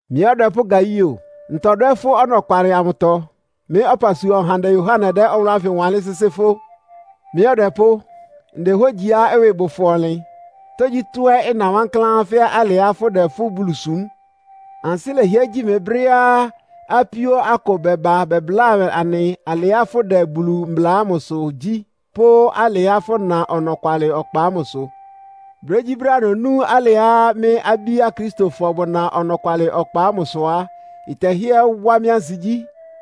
Mɩ́ ɔdwɛpʋ́ Gaio, ntɔdwɛ́ fʋ́ ɔnɔkwalɩ amʋtɔ. Mɩ́ ɔpasua ɔhandɛ Yohane dɛ́ ɔwʋlʋ́ ánfɩ wanlɩ́n sɩ́sɩ́ fʋ́. Mɩ́ ɔdwɛpʋ́, ndehógyiá ɩwɩ bʋ fʋ ɔnlɩn, tógyítɔ́ ɛ́ ɩna wankláán fɛ́ alɩá fʋ́dɛ fʋ́ Bulu súm. Ansɩ́ lɛhɩɛ́ gyi mɩ brɛ́á apíó akʋ bɛba bɛbláa anɩ alɩá fʋdɛ Bulu mbla ámʋsʋ gyí, pʋ́ alɩá fʋna ɔnɔkwalɩ ɔkpa ámʋsʋ. Brégyíbrɛ́á nonú alɩá mɩ́ abí Akristofɔ bʋna ɔnɔkwalɩ ɔkpa ámʋsʋ á, ɩtɛhɩ́ɛ́ wá mɩ́ ansigyí.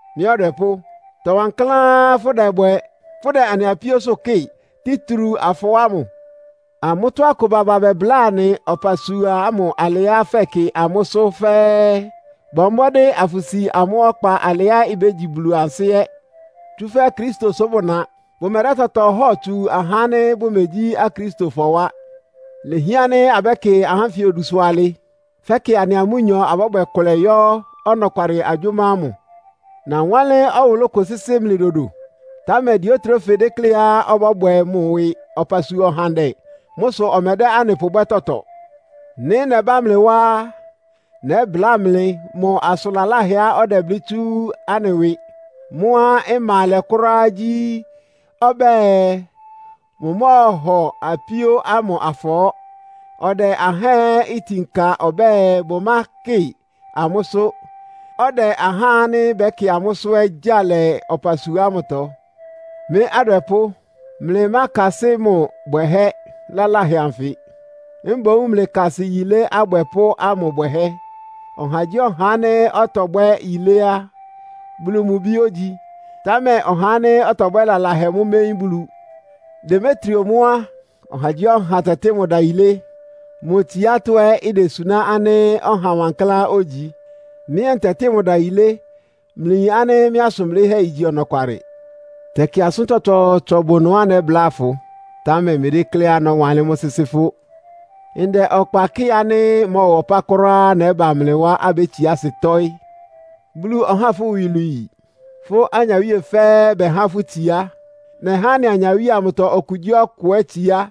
Mɩ́ ɔdwɛpʋ́, ɩtɔ wankláán fʋ́dɛbwɛ, fʋ́dɛ anɩ apíósʋ́ kɩ́ɩ, títriu afɔɔ́ ámʋ. Amʋ́tɔ́ akʋ baba bɛbláa anɩ ɔpasua ámʋ alɩá fɛkɩ amʋ́sʋ́ fɛ́ɛ́. Bɔ mbɔ́dɩ́ afʋsi amʋ́ ɔkpa alɩá ibégyi Bulu ansɩ́ ɛ́. Tsúfɛ́ Kristo sʋ bʋ́na. Bʋmɛdɛ́ tɔtɔ hɔ́ɔ tsu ahá ánɩ́ bʋmegyí Akristofɔ wá. Ilehián ánɩ́ abɛ́kɩ ahá ánfɩ odusʋ alɩ, fɛ́kɩ anɩa amʋ́nyɔ abɔ́bwɛ kʋlɛ yɔ́ ɔnɔkwalɩ agyʋ́má ámʋ. Nawánlɩ́n ɔwʋlʋ́ kʋ sɩ́sɩ́ mlɩ dodo, támɛ Diotrefe dékléá ɔbɔ́bwɛ mʋ ɩwɩ ɔpasua ɔhandɛ. Mʋ́ sʋ ɔmɛdɛ́ anɩ pʋbwɛ́ tɔtɔ. Nɩ́ nɛbá mlɩ wá á, nɛ́bláa mlɩ mʋ asʋn laláhɛá ɔdɛblɩ́ tsú anɩ ɩwɩ. Mʋ́á ɩma alɛ kʋ́ráá gyí, ɔbɛ́ɛ, mʋmɔ́ɔhɔ apíó ámʋ afɔɔ́. Ɔdɛ ahá ɛ́ itin ka ɔbɛ́ɛ, bʋmákɩ amʋ́sʋ́, ɔdɛ ahá ánɩ́ bɛkɩ amʋ́sʋ́ ɛ́ gyáa lɛ ɔpasua ámʋtɔ. Mɩ́ adwɛpʋ́, mlɩmákasɩ́ mʋ bwɛhɛ́ laláhɛ anfɩ. Mboún mlɩkasɩ yilé abwɛpʋ́ ámʋ bwɛhɛ́. Ɔhagyíɔha ánɩ́ ɔtɔbwɛ́ yilé á, Bulu mʋ bi ógyi, támɛ ɔhá ánɩ́ ɔtɔbwɛ́ lalahɛ mʋ́ méyín Bulu. Demetrio mʋ́ á, ɔhagyíɔha tɛtɩ́ mʋ ɩdayilé. Mʋ tsiátɔ́ ɛ́ idesuná ánɩ́ ɔha wankláán ogyi. Mɩ́ ɛ́ ntɛtɩ́ mʋ ɩdayilé. Mlɩyin ánɩ́ mɩ́ asʋn blɩ́hɛ́ igyi ɔnɔkwalɩ. Tɛkɩ asʋ́n tsɔtsɔɔtsɔ bʋ ɩnʋá nɛ́bláa fʋ, támɛ mmedékléá nɔ́wanlɩ́n mʋ́ sɩ́sɩ́ fʋ́. Ndɛ ɔkpa kɩ́ɩ ánɩ́ ɩmɔ́ɔwa ɔpá kʋ́ráá nɛ́ba mlɩ wá, abétsiá asɩ tɔ́ɩ́. Bulu ɔháa fʋ́ iwilwii. Fʋ́ anyawíe fɛ́ɛ́ bɛhá fʋ́ itsiá. Nɛhá anɩ anyawíe amʋtɔ okugyíɔkʋ ɛ́ itsiá.